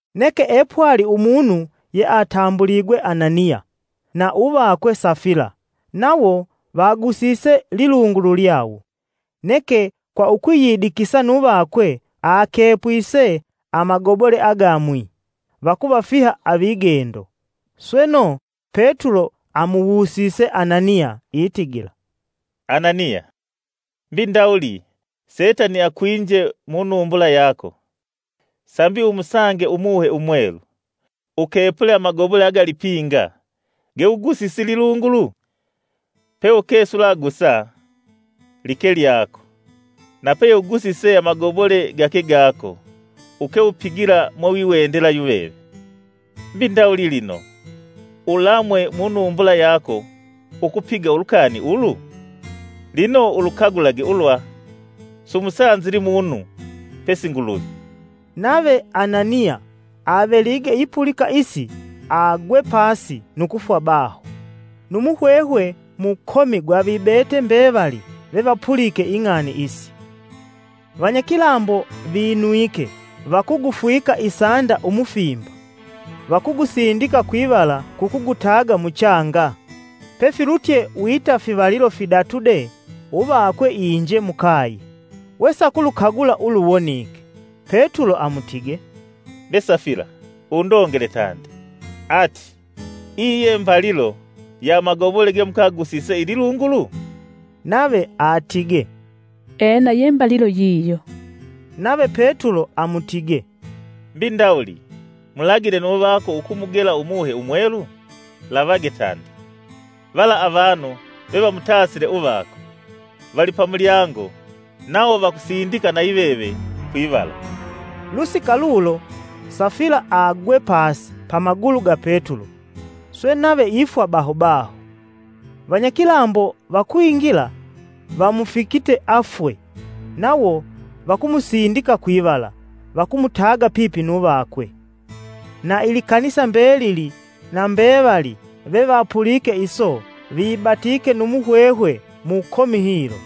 Neke epwali umunu yeatambuligwe Ananiya na uvakwe Safila nawo vagusise lilungulu lyawo. Neke kwa ukwiyidikisa nu vakwe akepwise amagobole agamwi vakuvafiha avigendo. Sweno, Petulo amuwusise Ananiya itigila, “Ananiya, mbi ndawuli Setani akwinje mu numbula yako, sambi umusange Umuhe Umwelu, ukepule amagobole agalipinga gewugusise lilungulu? Peuke sulagusa, like lyako, na peye ugusise amagobole gake gako uke upigila mwewiwendela yuveve. Mbi ndawuli lino, ulamwe munumbula yako ukupiga ulukani ulu? Lino ulukagulage ulwa sumusanzili munu pesi Nguluvi!” Nave Ananiya avelige ipulika isi, agwe pasi nu kufwa baho. Nu muhwehwe mukomi gwavibete mbevali vevapulike ing'ani isi. Vanyakilambo vinwike, vakugufwika isanda umufimba, vakugusindika kwivala kukugutaga muchanga. Pefilutye wita fivalilo fidatu de, uvakwe inje mukaye, we sakulukagula uluwonike. Petulo amutige, “Be Safila undongele tandi, ati iyi ye mbalilo ya amagobole gemukagusise ililungulu?” Nave atige, “Ena ye mbalilo yiyo.” Nave Petulo amutige, “Mbi ndawuli mulagine nu vako ukumugela Umuhe Umwelu? Lavage tandi! Vala avanu vevamutasile uvako, vali pamulyango, nawo vakusindika nayiveve kwivala.” Lusika lulo Safila agwe pasi pamagulu ga Petulo, swe nave ifwa baho baho. Vanyakilambo vakwingila, vamufikite afwe, nawo vakumusindika kwivala, vakumutaga pipi nu vakwe. Na Ilikanisa mbelili na mbevali vevapulike iso, vibatike nu muhwehwe mukomi hilo.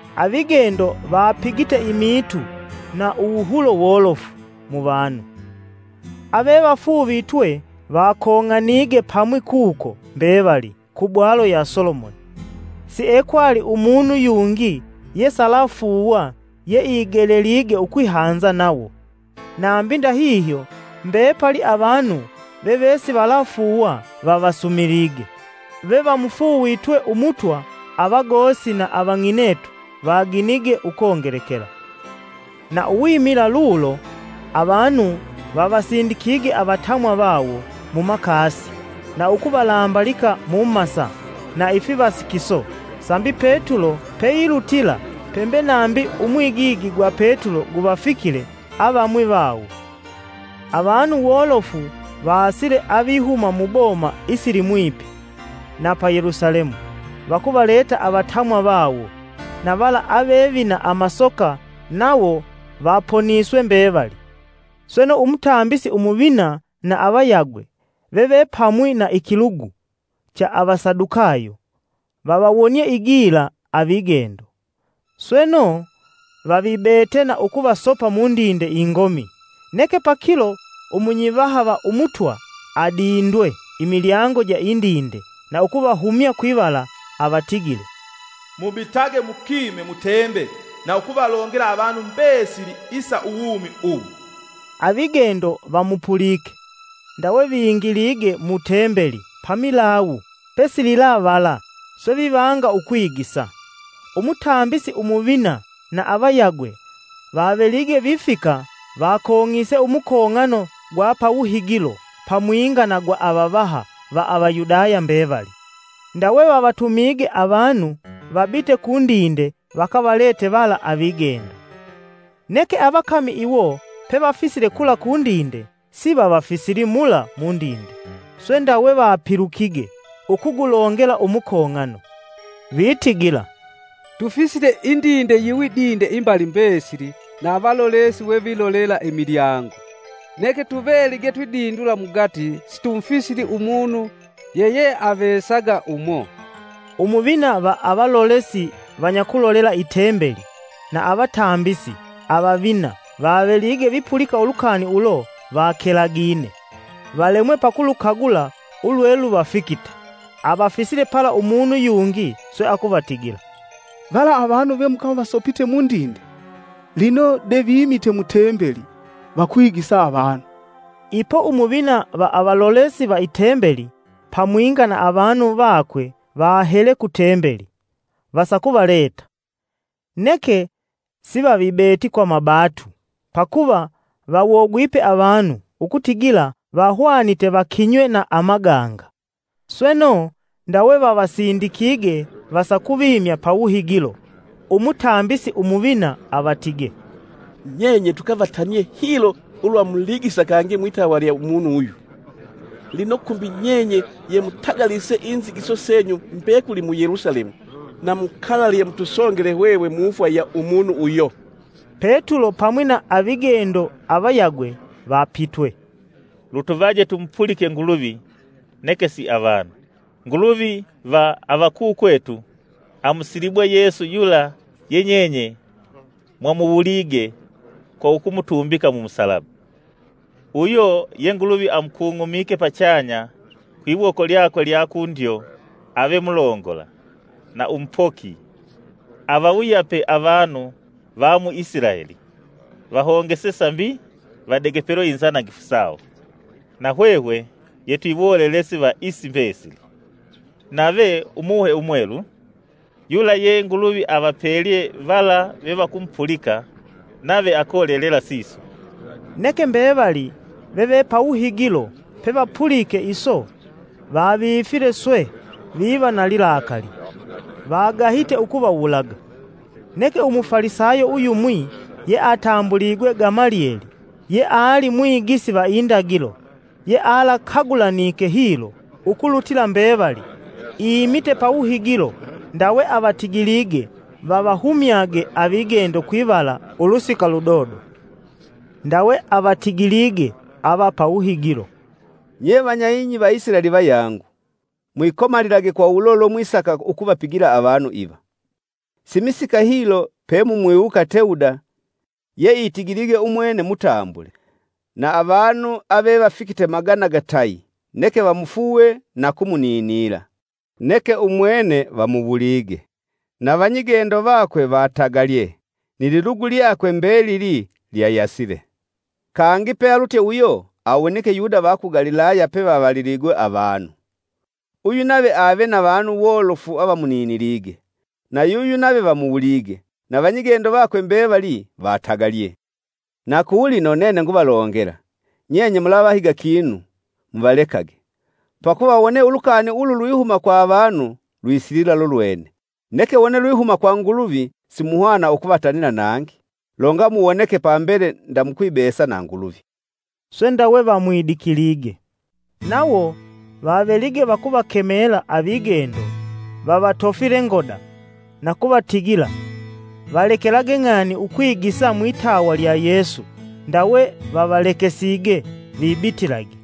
Avigendo vapigite imiitu na uwuhulo wolofu muvanu. Avevafuuvitwe vakong'anige pamwi kuko mbevali, ku bwalo ya Solomoni. Siekwali umunu yungi yesalafuuwa yeigelelige ukwihanza nawo. Nambi ndahihyo mbepali avanu vevesivalafuuwa vavasumilige. Vevamufuuvitwe Umutwa avagosi na avang'inetu, vaginige ukongelekela. Na uwimila lulo, avanu vavasindikige avatamwa vawo mumakasi na ukuvalambalika mumasa na ifivasikiso sambi Petulo peilutila, pembe nambi umwigigi gwa Petulo guvafikile avamwi vawo. Avanu wolofu vasile avihuma muboma isilimwipi na pa Yelusalemu vakuvaleta avatamwa vawo, na vala avevina amasoka, nawo vaponiswe mbevali. Sweno Umutambisi umuvina na avayagwe vevepamwi na ikilugu cha avasadukayo, vavawonie igila avigendo. Sweno, vavibete na ukuvasopa mundinde ingomi. Neke pakilo umunyivaha va Umutwa adindwe imilyango ja indinde, na ukuvahumya kwivala, avatigile, “Mubitage mukime mu Tembeli na ukuvalongela avanu mbesili isa uwumi uwu.” Avigendo vamupulike, ndawe vingilige mu Tembeli pamilawu pesililavala, swe vivanga ukwigisa. Umutambisi Umuvina na avayagwe vavelige vifika, vakong'ise umukong'ano gwa pawuhigilo pamwinga na gwa avavaha va Avayudaya mbevali, ndawe vavatumige avanu vabite kundinde vakavalete vala avigendo. Neke avakami iwo pevafisile kula kundinde sivavafisili mula mundinde. Swe ndawe vapilukige ukugulongela umukong'ano, vitigila, “Tufisile indinde yiwidinde imbali mbesili na avalolesi wevilolela imilyango. Neke tuvelige twidindula mugati situmufisili umunu yeyeavesaga umo.” Umuvina va avalolesi vanyakulolela i Tembeli na avatambisi avavina vavelige vipulika ulukani ulo vakelagine, valemwe pakulukagula ulweluvafikite. Avafisile pala umunu yungi swe akuvatigila, “Vala avanu vemukavasopite mundinde, lino de vimite mu Tembeli, vakwigisa vanu!” Ipo Umuvina va avalolesi va i Tembeli pamwinga na avanu vakwe vahele ku Tembeli, vasakuvaleta. Neke sivavibeti kwa mabatu, pakuva vawogwipe avanu ukutigila vahwanite vakinywe na amaganga. Sweno, ndawe vavasindikige, vasakuvimya pawuhigilo. Umutambisi Umuvina avatige, “Nyenye tukavatanie hilo ulwa muligisa kangi mwitawa lya umunu uyu; lino kumbi nyenye yemutagalise inzigiso senyu mbekuli mu Yelusalemu, na mukalalye mutusongele hwehwe mufwa ya umunu uyo.” Petulo pamwi na avigendo avayagwe vapitwe, “Lutuvaje tumupulike Nguluvi neke si avanu. Nguluvi va avakukwetu amusilibwe Yesu yula ye nyenye mwamuwulige kwa ukumutumbika mu musalaba. Uyo ye Nguluvi amukung'umike pachanya kwiwoko lyakwe lya kundyo ave Mulongola, na Umupoki, avawuyape avanu va mu Isilaeli vahongese sambi vadegepelwa inzanangifu sawo. Na hwehwe yetwiwolelesi va isi mbesili, nave Umuhe Umwelu, yula ye Nguluvi avapelye vala vevakumupulika nave akolelela siso.” Neke mbevali veve pawuhigilo pevapulike iso vavifile swe viva na lilakali, vagahite ukuvawulaga. Neke Umufalisayo uyumwi yeatambuligwe Gamalieli, yeali mwigisi va indagilo yealakagulanike hilo ukulutila mbevali, imite pawuhigilo ndawe avatigilige vavahumyage avigendo kwivala kwa ulusika ludodo. Ndawe avatigilige avapawuhigilo, “Nye vanya ing'i va Isilaeli vayangu, mwikomalilage kwa ulo lwemwisaka ukuvapigila avanu iva! Simisika hilo, pemumwiwuka Tewuda yeitigilige umwene mutambule na avanu ave vafikite magana gatayi neke vamufuuwe na kumuninila. Neke umwene vamuwulige, na vanyigendo vakwe vatagalye nililugu lyakwe mbelili lyayasile. Kangi pealutye uyo awonike Yuda va ku Galilaya pevavaliligwe avanu. Uyu nave ave na vanu wolofu avamuninilige, na yuyu nave vamuwulige, na vanyigendo vakwe mbevali vatagalye. Na kulino nene nguvalongela, nyenye mulavahiga kinu; muvalekage! Pakuva, wone ulukani ulu lwihuma kwa avanu lwisilila lulwene, neke wone lwihuma kwa Nguluvi, simuhwana ukuvatanila nangi longamuwoneke, pambele nda mukwibesa na Nguluvi.” Swe ndawe vamwidikilige. Nawo vavelige vakuvakemela avigendo, vavatofile ngoda, na kuvatigila, valekelage ng'ani ukwigisa mwitawa lya Yesu ndawe vavalekesige vitibitilage.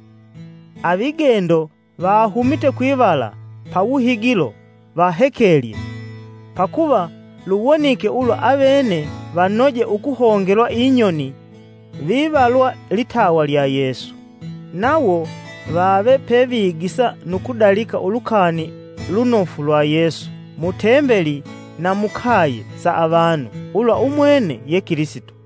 Avigendo vahumite kwivala pawuhigilo vahekelye, pakuva luwonike ulwa avene vanoje ukuhongelwa inyoni vivalwa litawa lya Yesu. Nawo vave pevigisa nu kudalika ulukani lunofu lwa Yesu, mu Tembeli na mukaye sa avanu ulwa umwene ye Kilisito.